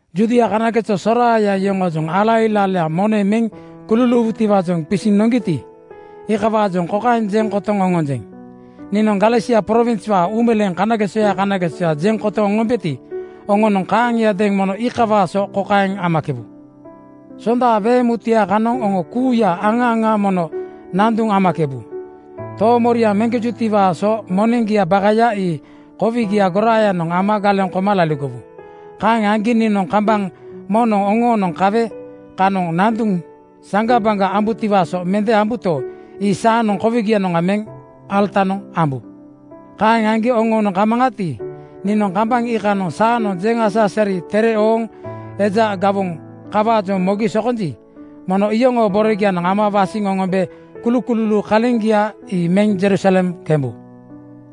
Judia kanageso soraaya yoŋoojoŋ ala ilailaa moneŋ meŋ kululuuwutiwaajoŋ qisiŋ noŋgiti, iikawaajoŋ kokaeŋ jeŋ kotoŋ oŋonjeŋ: Niinoŋ Galesia prowinswaa uumeleeŋ kanagesoya kanagesoya jeŋ kotoŋ oŋombeti, oŋonoŋ kaaŋiadeeŋ mono iikawaa so kokaeŋ amakebu: Sonda so weeŋ mutuya kanoŋ oŋo kuuya aŋa aŋa mono nanduŋ amakebu. Toomoriaŋ meŋkejutiwaa so moneŋgia bakaya ii kowigiaa goraayanoŋ ama galeŋ koma laligowu. Kaeŋ aŋgi niinoŋ kambaŋ moŋnoŋ oŋoonoŋ kawe kanoŋ nanduŋ saŋgabaŋga ambutiwaa so mende ambuto, ii saanoŋ kowigianoŋga meŋ alatanoŋ ambu. Kaeŋ aŋgi oŋoonoŋ kamaŋati, niinoŋ kambaŋ iikanoŋ saanoŋ jeŋ-asa-asari tere ooŋ eja gawoŋ kawaajoŋ mogi sokonji, mono iyoŋoo borogianoŋ ama wasiŋ oŋombe kulukululuu kaleŋgia ii meŋ Jerusalem kembu.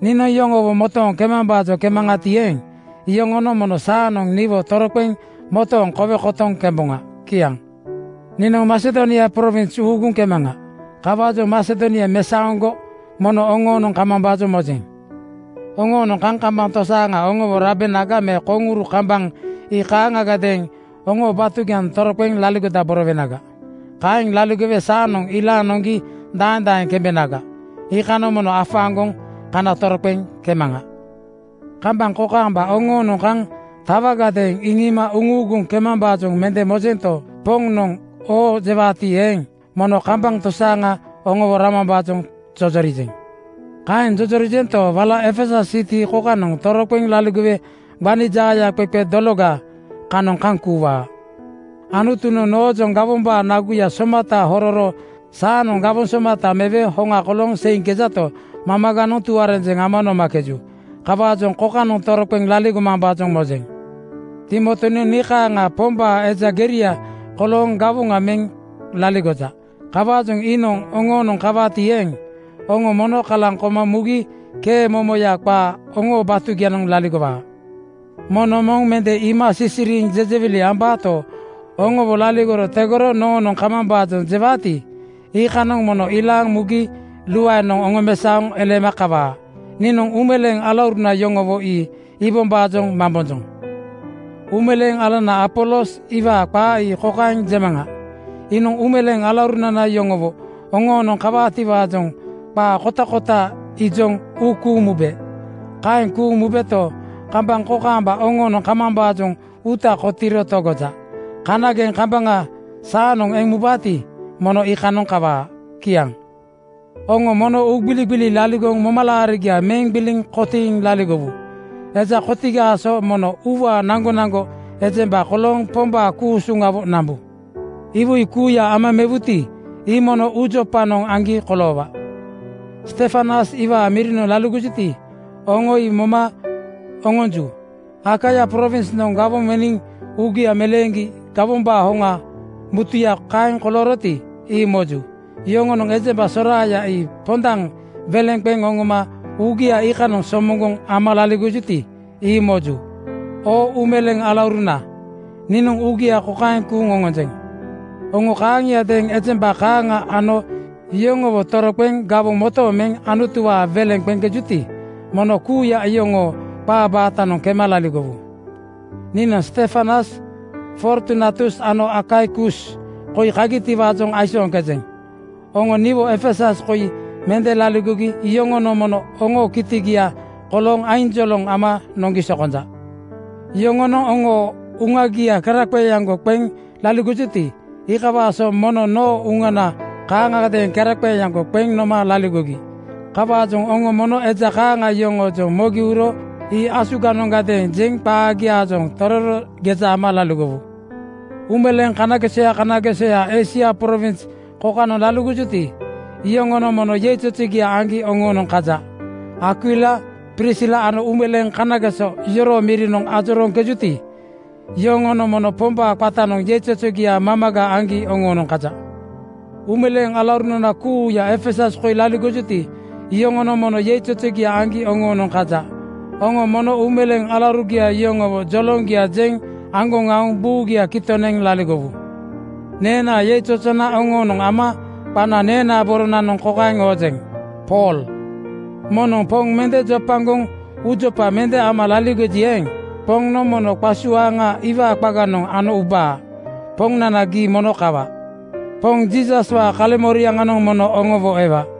Niinoŋ yoŋowo motooŋ kemambaajoŋ kemaŋati eeŋ, iyoŋonoŋ mono saanoŋ niwo toroqeŋ motooŋ kowe kotoŋ kemboŋa. Kiaŋ. Niinoŋ Masedonia prowins uuguŋ kemaŋa. Kawaajoŋ Masedonia mesaoŋgo mono oŋoonoŋ kamambaajoŋ mojeŋ. Oŋoonoŋ kaŋ kambaŋ tosaaŋa oŋowo rabenaga me koŋuru kambaŋ (winter) ii kaaŋagadeeŋ oŋoo batugianoŋ toroqeŋ laligodaborowenaga. Kaeŋ laligowe saanoŋ ilaaŋ noŋgi daeŋ daeŋ kembenaga, iikanoŋ mono afaaŋgoŋ kana toroqeŋ kemaŋa. Kambaŋ kokaamba oŋoonoŋ kaŋ tatawagadeeŋ iŋiima uŋuuguŋ kemambaajoŋ mende mojento, Poŋnoŋ oo jewaati eeŋ, mono kambaŋ tosaaŋa oŋowo ramambaajoŋ jojorijeŋ. Kaeŋ jojorijento, wala Efesus siti kokanoŋ toroqeŋ laligowe gbani jaayaqeqe dologa (pentekost) kanoŋ kaŋ kuuwaa. Anutunoŋ noojoŋ gawombaa naguya somata hororo saanoŋ gawoŋ somata mewe hoŋa kolooŋ seiŋkejato, mamaganoŋ tuarenjeŋ ama nomakeju. Kawaajoŋ kokanoŋ toroqeŋ laligomambaajoŋ mojeŋ. Timotinoŋ nii kaaŋa Pombaa eja geria kolooŋ gawoŋa meŋ laligoja. Kawaajoŋ iinoŋ oŋoonoŋ kawaati eeŋ, oŋo mono kalaŋ koma mugi kee momoya qaa oŋoo batugianoŋ laligowaa. Moŋnoŋ moŋ mende iima sisiriiŋ jejewili ambato, oŋowo laligoro tegoro noonoŋ kamambaajoŋ jewaati, iikanoŋ mono ilaaŋ mugi luaenoŋ oŋomesaoŋ eleema kawa. Niinoŋ uumeleeŋ alauruna yoŋowo ii iibombaajoŋ mambonjoŋ. Uumeleeŋ alanana Apolos iwaa qaa ii kokaeŋ jemaŋa: Iinoŋ uumeleeŋ alauruna yoŋowo oŋoonoŋ kawaatiwaajoŋ qaa kotakota ijoŋ uu kuuŋ mube. Kaeŋ kuuŋ mubeto, kambaŋ kokaamba oŋoonoŋ kamambaajoŋ uuta kotiiro togoja. Kanageŋ kambaŋa saanoŋ eŋ mubaati, mono iikanoŋ kawaa. Kiaŋ. Oŋo mono uugbiligbili laligoŋ momalaarigia meŋ gbiliŋ kotiiŋ laligowu. Eja kotigaa so mono uuwaa naŋgonaŋgo ejemba kolooŋ Pombaa ku-usuŋawo nambu. Iwoi kuuya ama mewuti, ii mono uujopanoŋ aŋgi koloowaa. Stefanas iwaa mirinoŋ laligojuti, oŋo ii moma oŋonju. Akaia prowinsnoŋ gawoŋ meniŋ uugia meleeŋgi gawonanaa hoŋa mutuya kaeŋ kolooroti, ii moju. Yoŋonoŋ ejemba soraaya ii pondaŋ weleŋ qeŋ oŋoma uugia iikanoŋ somoŋgoŋ ama laligojuti, ii moju. Oo uumeleeŋ alauruna, niinoŋ uugia kokaeŋ kuuŋ oŋonjeŋ: Oŋo kaaŋiadeeŋ ejemba kaaŋa ano yoŋowo toroqeŋ gawoŋ motooŋ meŋ Anutuwaa weleŋ qeŋkejuti, mono kuuya iyoŋoo qaa baatanoŋ kema laligowu. Niinoŋ Stefanas Fortunatus ano Akaikus koi kagitiwaajoŋ aisooŋkejeŋ. Oŋo niwo Efesus koi mende laligogi yoŋonoŋ mono oŋoo kitigia kolooŋ ainjoloŋ ama noŋgi sokonja. Yoŋonoŋ oŋoo uŋagia keraqeeaŋgo qeŋ laligojuti, iikawaa so mono noo uŋana kaaŋagadeeŋ keraqeeaŋgo qeŋ noma laligogi. Kawaajoŋ oŋo mono eja kaaŋa yoŋoojoŋ mogi uro ii asuganoŋgadeeŋ jeŋ qaagiaajoŋ tororo geja ama laligowu. Uumeleeŋ kanagesoya kanagesoya Eisia prowins kokanoŋ laligojuti, iyoŋonoŋ mono yeizozogia aŋgi oŋoonoŋ kaja. Akwila Prisila ano uumeleeŋ kanageso yoroo mirinoŋ ajorooŋkejuti, iyoŋonoŋ mono Pombaa qatanoŋ yeizozogia mamaga aŋgi oŋoonoŋ kaja. Uumeleeŋ alauruna kuuya Efesus koi laligojuti, iyoŋonoŋ mono yeizozogia aŋgi oŋoonoŋ kaja. Oŋo mono uumeleeŋ alaurugia yoŋowo joloŋgia jeŋ aŋgoŋ aoŋ buugia kitoŋ neŋ laligowu. Neenaa yeizozona oŋoonoŋ ama qana neenaa boronanoŋ kokaeŋ oojeŋ: Pool. Moŋnoŋ Poŋ mende jopagoŋ uujopa mende ama laligoji eeŋ, Poŋnoŋ mono qasuaaŋa iwaa qaganoŋ ano ubaa. Poŋnana, gii mono kawa! Poŋ Jiisaswaa kaleŋmoriaŋanoŋ mono oŋowo ewa.